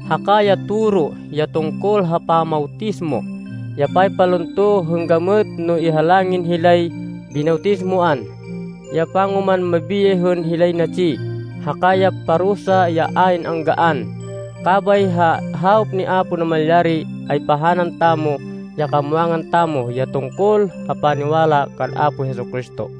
haka ya toro ya tungkol ha pamawtismo, ya paypalunto hên gamêt no ihalangin hilay binawtismoan, ya pangoman mabiyay hên hilay natsi, haka ya parusa ya ayn anggaan. Kabay ha hawop ni Apo Namalyari, ay pahanan tamo ya kamwangan tamo ya tungkol ha paniwala kan Apo Jesu-Cristo.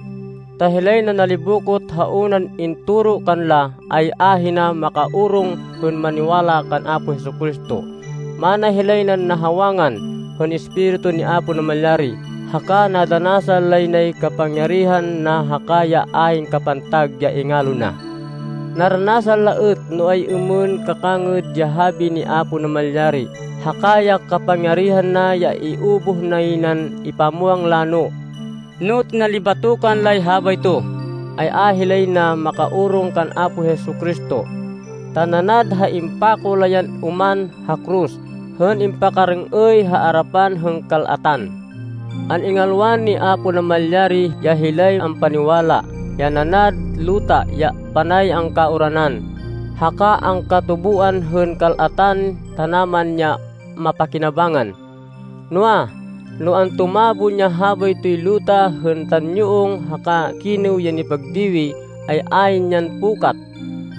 Ta hilay nanalibokot ha unan intoro kanla ay ahina makaorong hên maniwala kan Apo Jesu-Cristo. Mana hilay nan nahawangan hên Espiritu ni Apo Namalyari haka nadanasan lay nay kapangyarihan na haka ya ayn kapantag ya ingalo na. Naranasan la êt no ay-êmên kakangêd ya habi ni Apo Namalyari haka ya kapangyarihan na ya iubuh nay nan ipamwang lano. No tinalibatokan lay habayto, ay a hilay na makaorong kan Apo Jesu-Cristo, ta nanad ha impako la yan oman ha koros hên impakarêng-êy ha arapan hên kal-atan. An-ingalwan ni Apo Namalyari ya hilay ampaniwala, ya nanad luta ya panay angkauranan, haka angkatuboan hên kal-atan tanaman ya mapakinabangnan. Noa, no antumabon ya habaytoy luta hên tanyuong haka kinêw ya nipagdiwi, ay ayn yan pukat.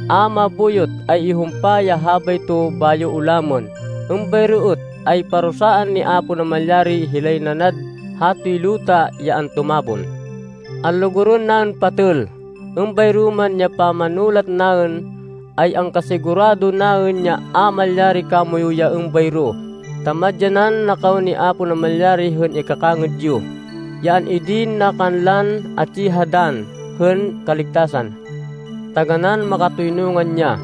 A mabuyot ay ihumpa ya habayto bayo ulamên. Êmbayro êt ay parusaan ni Apo Namalyari hilay nanad hatoy luta ya antumabon. Anlugurên naên patêl, êmbayro man ya pamanulat naên, ay angkasigurado naên ya a malyari kamoyu ya êmbayro, ta madyanan na kaw ni Apo Namalyari hên ikakangêd yo, ya an-idin na kanlan atsi ha dann hên kaligtasan. Taganán makatoynungan ya.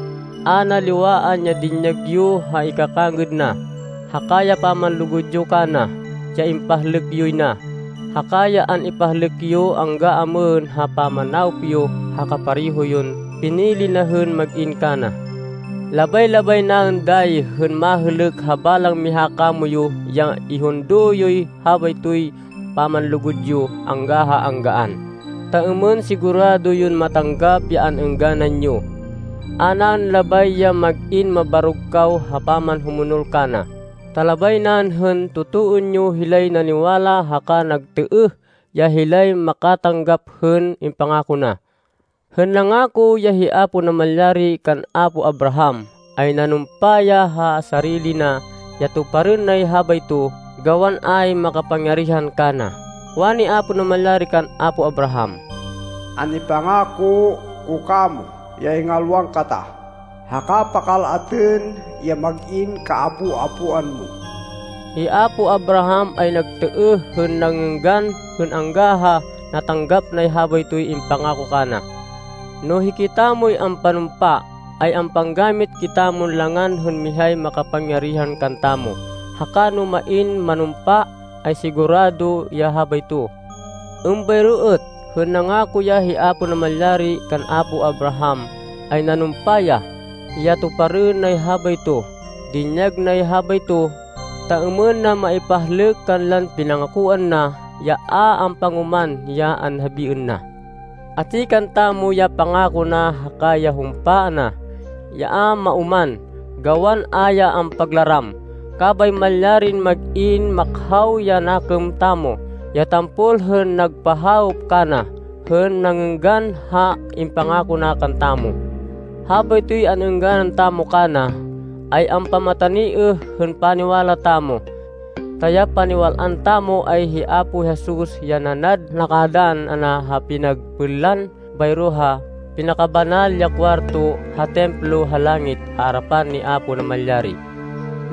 A na liwaan ya dinyag yo ha ikakangêd na, haka ya pamanlugud yo kana, ya impahlêk yoy na, haka ya an-ipahlêk yo angga amêhên ha pamanawop yo ha kapareho yon pinili na hên mag-in kana. Labay-labay naên dayi hên mahêlêk ha balang miha kamoyu ya ihundo yoy habaytoy pamanlugud yo angga ha anggaan, ta êmên sigurado yon matanggap ya an-êngganan yo. A naên labay ya mag-in mabarog kaw ha pamanhumonol kana, ta labay naên hên totoên yo hilay naniwala haka nagtêêh, ya hilay makatanggap hên impangako na. Hên nangako ya hi Apo Namalyari kan apo Abraham, ay nanumpa ya ha sarili na ya tuparên nay habayto gawan ayn makapangyarihan kana. Wani Apo Namalyari kan apo Abraham, “An-ipangako ko kamo ya ingalwan kata haka pakal-atên ya mag-in kaapo-apoan mo.” Hi apo Abraham ay nagtêêh hên nangênggan hên angga ha natanggap nay habaytoy impangako kana. No hikitamoy ampanumpa, ay ampanggamit kitamon langan hên mihay makapangyarihan kantamo, haka no main manumpa, ay sigurado ya habayto. Êmbayro êt, hên nangako ya hi Apo Namalyari kan apo Abraham, ay nanumpa ya, ya tuparên nay habayto. Dinyag nay habayto, ta êmên na maipahlêk kanlan pinangakoan na, ya a ampangoman ya anhabiên na. Atsi kantamo ya pangako na haka ya humpa na, ya a maoman gawan a ya ampaglaram. Kabay malyarin mag-in makhaw ya nakêm tamo ya tampol hên nagpahawop kana, hên nangênggan ha impangako na kantamo. Habaytoy an-êngganan tamo kana, ay ampamataniêh hên paniwala tamo. Ta ya paniwal-an tamo ay hi Apo Jesus ya nanad nakadann ana ha pinagpênlan bayro ha Pinakabanal ya Kuwarto ha Templo ha langit ha arapan ni Apo Namalyari.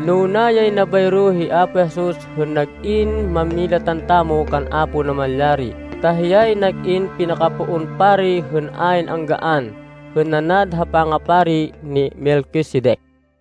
Nuna yay na bayro hi Apo Jesus hên nag-in mámilatan tamo kan Apo Namalyari ta hiyay nag-in pinakapoon pari hên ayn anggaan, hên nanad ha pangapari ni Melquisedec.